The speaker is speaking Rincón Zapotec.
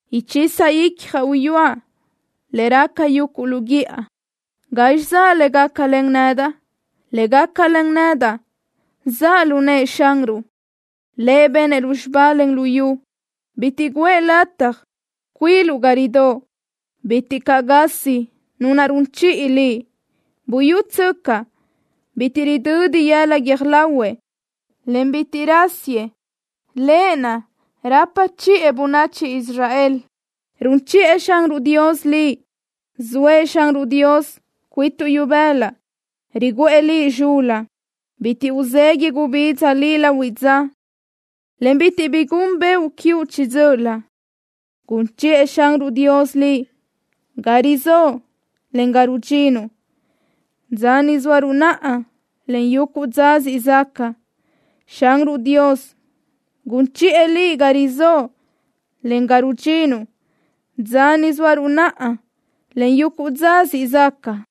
Uchisa icjaʼ uyúaʼ le raca yuguʼ lu guíʼa. ¿Gazxi zaʼ le gácalen nedaʼ? Le gácalen nedaʼ zaʼ lu nëʼë Xanruʼ. Lëʼ benëʼ lúzxiba, en luyú. Bitiʼ guʼë lataj cuiluʼ ga ridóʼ. Bitiʼ caʼ gasi Nu naʼ run chiʼi liʼ. Buyútsöcaʼ, bitiʼ ridödi yëla guiö́j lahuëʼ, en bitiʼ rásiëʼ, Lëʼ naʼ rapa chiʼë bönachi Israel. Run chiʼë Xanruʼ Dios liʼ. Zoëʼ Xanruʼ Dios cuituʼ ibëla, riguʼë liʼ zxul-la. Bitiʼ uzeguiʼ gubidza liʼ lahuiʼ dza, en bitiʼ bi gun beoʼ quiuʼ chiʼi dzö́ʼölö. Gun chiʼë Xanruʼ Dios liʼ ga rizóʼo, en ga rudxinuʼ, dza ni zóaruʼ naʼa, en yuguʼ dza siʼ zaca. Xanruʼ Dios gun chiʼë liʼ ga rizóʼo, en ga rudxinuʼ, dza ni zóaruʼ naʼa, en yuguʼ dza siʼ zaca.